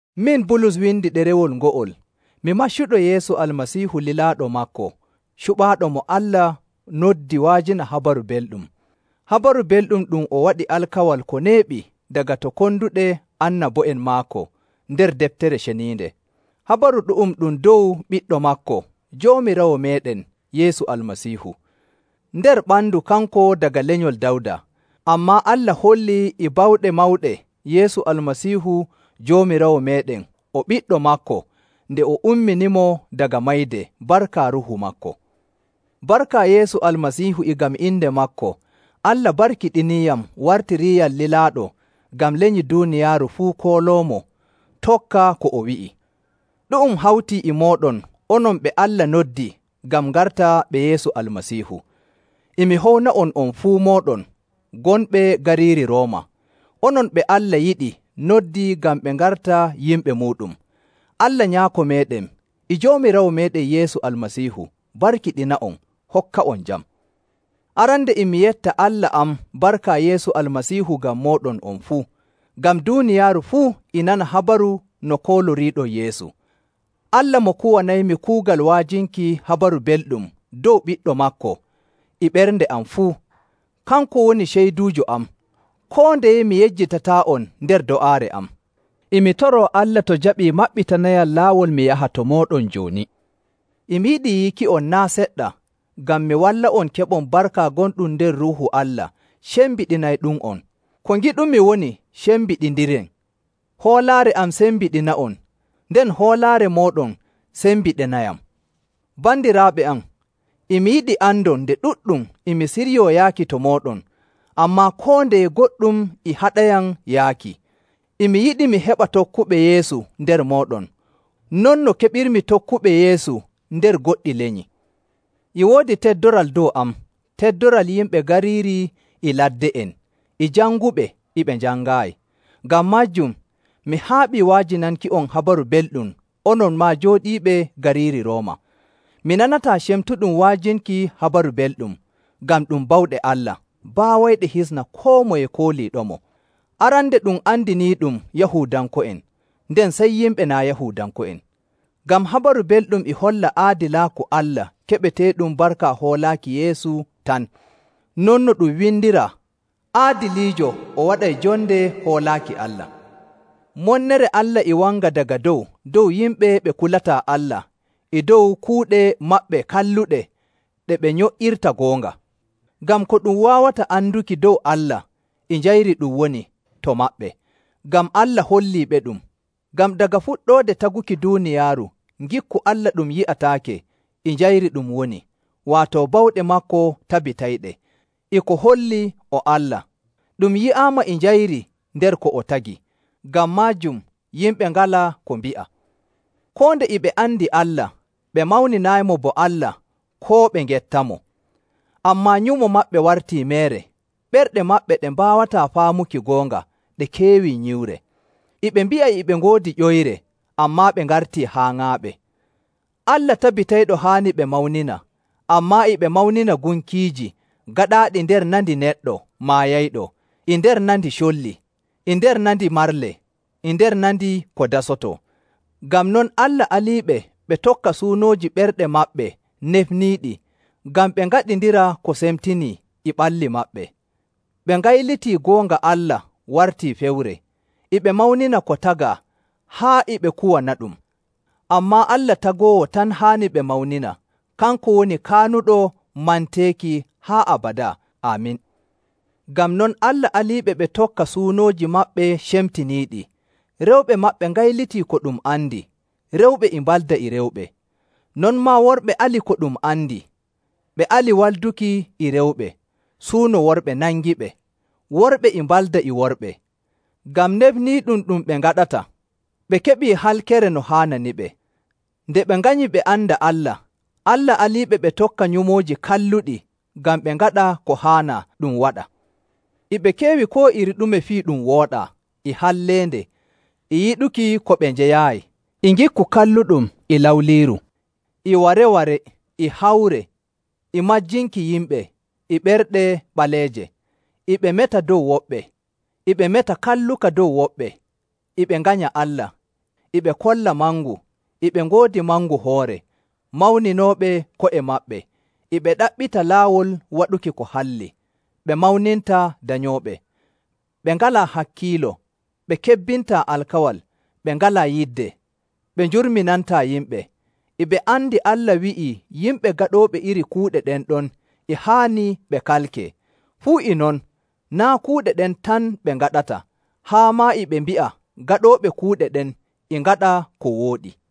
Min Bulus windi ɗerewol ngo'ol. Mi maccuɗo Yeesu Almasiihu lilaaɗo maako cuɓaaɗo mo Allah noddi wa'ajina Habaru Belɗum. Habaru Belɗum ɗum o waɗi alkawal ko neeɓi daga to konduɗe annabo'en maako nder Deftere Ceniinde. Habaru ɗu'um ɗum dow ɓiɗɗo maako Joomiraawo meeɗen Yeesu Almasiihu. Nder ɓandu kanko daga lenyol Dawda. Ammaa Allah hollii e bawɗe mawɗe Yeesu Almasiihu Joomiraawo meeɗen o ɓiɗɗo maako nde o umminimo daga mayde barka Ruuhu maako. Barka Yeesu Almasiihu e ngam inde maako, Allah barkiɗiniiyam wartiriiyam lilaaɗo ngam lenyi duuniyaaru fuu hooloomo tokka ko o wi'i. Ɗu'um hawtii e mooɗon onon ɓe Allah noddi ngam ngarta ɓe Yeesu Almasiihu. E mi howna'on on fuu mooɗon gonɓe gariiri Rooma, onon ɓe Allah yiɗi noddi ngam ɓe ngarta yimɓe muuɗum. Allah Nyaako meeɗen e Joomiraawo meeɗen Yeesu Almasiihu barkiɗina'on hokka'on jam. Arande, e mi yetta Allah am barka Yeesu Almasiihu ngam mooɗon on fuu, ngam duuniyaaru fuu e nana habaru no kooloriiɗon Yeesu. Allah mo kuwanaymi kuugal wa'ajinki Habaru Belɗum dow Ɓiɗɗo maako e ɓernde am fuu, kanko woni ceyduujo am, koo ndeye mi yejjitataa'on nder do'aare am. E mi toroo Allah to o jaɓii o maɓɓitanayam laawol mi yaha to mooɗon jooni. E mi yiɗi yiiki'on naa' seɗɗa ngam mi walla'on keɓon barka gonɗum nder Ruuhu Allah cembiɗinayɗum'on. Ko ngiɗumi woni cembiɗindiren; hoolaare am sembiɗina'on, nden hoolaare mooɗon sembiɗinayam. Bandiraaɓe am, e mi yiɗi andon nde ɗuɗɗum e mi siryoo yaaki to mooɗon, ammaa koo ndeye goɗɗum e haɗayam yaaki. E mi yiɗi mi heɓa tokkuɓe Yeesu nder mooɗon, non no keɓirmi tokkuɓe Yeesu nder goɗɗi lenyi.. E woodi teddoral dow am, teddoral yimɓe gariiri e ladde'en, e janguɓe e ɓe njangaayi. Ngam maajum, mi haaɓii wa'ajinanki'on Habaru Belɗum onon maa jooɗiiɓe gariiri Rooma. Mi nanataa cemtuɗum wa'ajinki Habaru Belɗum, ngam ɗum bawɗe Allah baawayɗe hisna koo moye kooliiɗomo. Arande ɗum andiniiɗum Yahuudanko'en, nden sey yimɓe naa' Yahuudanko'en.. Ngam Habaru Belɗum e holla aadilaaku Allah keɓeteeɗum barka hoolaaki Yeesu tan. Non no ɗum windiraa, “Aadiliijo o waɗay jonde hoolaaki Allah.”. Monnere Allah e wanga daga dow dow yimɓe ɓe kulataa Allah e dow kuuɗe maɓɓe kalluɗe ɗe ɓe nyo''irta goonga. Ngam ko ɗum waawata anduki dow Allah, e njayri ɗum woni to maɓɓe, ngam Allah holliiɓeɗum. Ngam daga fuɗɗoode taguki duuniyaaru, ngikku Allah ɗum yi'ataake, e njayri ɗum woni, waato bawɗe maako tabitayɗe, e ko holli o Allah. Ɗum yi'aama e njayri nder ko o tagi. Ngam maajum, yimɓe ngalaa ko mbi'a. Koo nde e ɓe andi Allah, ɓe mawninaayimo bo Allah koo ɓe ngettamo, ammaa nyumo maɓɓe wartii meere, ɓerɗe maɓɓe ɗe mbaawataa faamuki goonga ɗe keewi nyiwre.. E ɓe mbi'a e ɓe ngoodi ƴoyre, ammaa ɓe ngartii haaŋaaɓe. Allah tabitayɗo haani ɓe mawnina, ammaa e ɓe mawnina gunkiiji gaɗaaɗi nder nandi neɗɗo maayayɗo, e nder nandi colli, e nder nandi marle, e nder nandi ko dasotoo. Ngam non, Allah aliiɓe ɓe tokka suunooji ɓerɗe maɓɓe nefniiɗi ngam ɓe ngaɗindira ko semtinii e ɓalli maɓɓe. Ɓe ngayliti goonga Allah warti fewre. E ɓe mawnina ko tagaa haa e ɓe kuwanaɗum, ammaa Allah Tagoowo tan haani ɓe mawnina. Kanko woni kaanuɗo manteeki haa abadaa! Aamin. Ngam non, Allah aliɓe ɓe tokka suunooji maɓɓe cemtiniiɗi. Rewɓe maɓɓe ngayliti ko ɗum andi, rewɓe e mbalda e rewɓe. Non maa worɓe ali ko ɗum andi, ɓe ali walduki e rewɓe, suuno worɓe nangiɓe. Worɓe e mbalda e worɓe. Ngam nefniiɗum ɗum ɓe ngaɗata, ɓe keɓi halkere no haananiɓe. Nde ɓe nganyii ɓe anda Allah, Allah aliiɓe ɓe tokka nyumooji kalluɗi ngam ɓe ngaɗa ko haanaa ɗum waɗa. E ɓe keewi koo iri ɗume fii ɗum wooɗaa, e halleende, e yiɗuki ko ɓe njeyaayi, e ngikku kalluɗum, e lawliiru, e ware‑ware, e hawre, e majjinki yimɓe, e ɓerɗe ɓaleeje. E ɓe meta dow woɓɓe, e ɓe meta kalluka dow woɓɓe, e ɓe nganya Allah, e ɓe kolla mangu, e ɓe ngoodi mangu hoore, mawninooɓe ko'e maɓɓe, e ɓe ɗaɓɓita laawol waɗuki ko halli, ɓe mawnintaa danyooɓe. Ɓe ngalaa hakkiilo, ɓe kebbintaa alkawal, ɓe ngalaa yidde, ɓe njurminantaa yimɓe. E ɓe andi Allah wi'ii yimɓe gaɗooɓe iri kuuɗe ɗen ɗon e haani ɓe kalkee. Fuu e non, naa' kuuɗe ɗen tan ɓe ngaɗata, haa maa e ɓe mbi'a gaɗooɓe kuuɗe ɗen e ngaɗa ko wooɗi.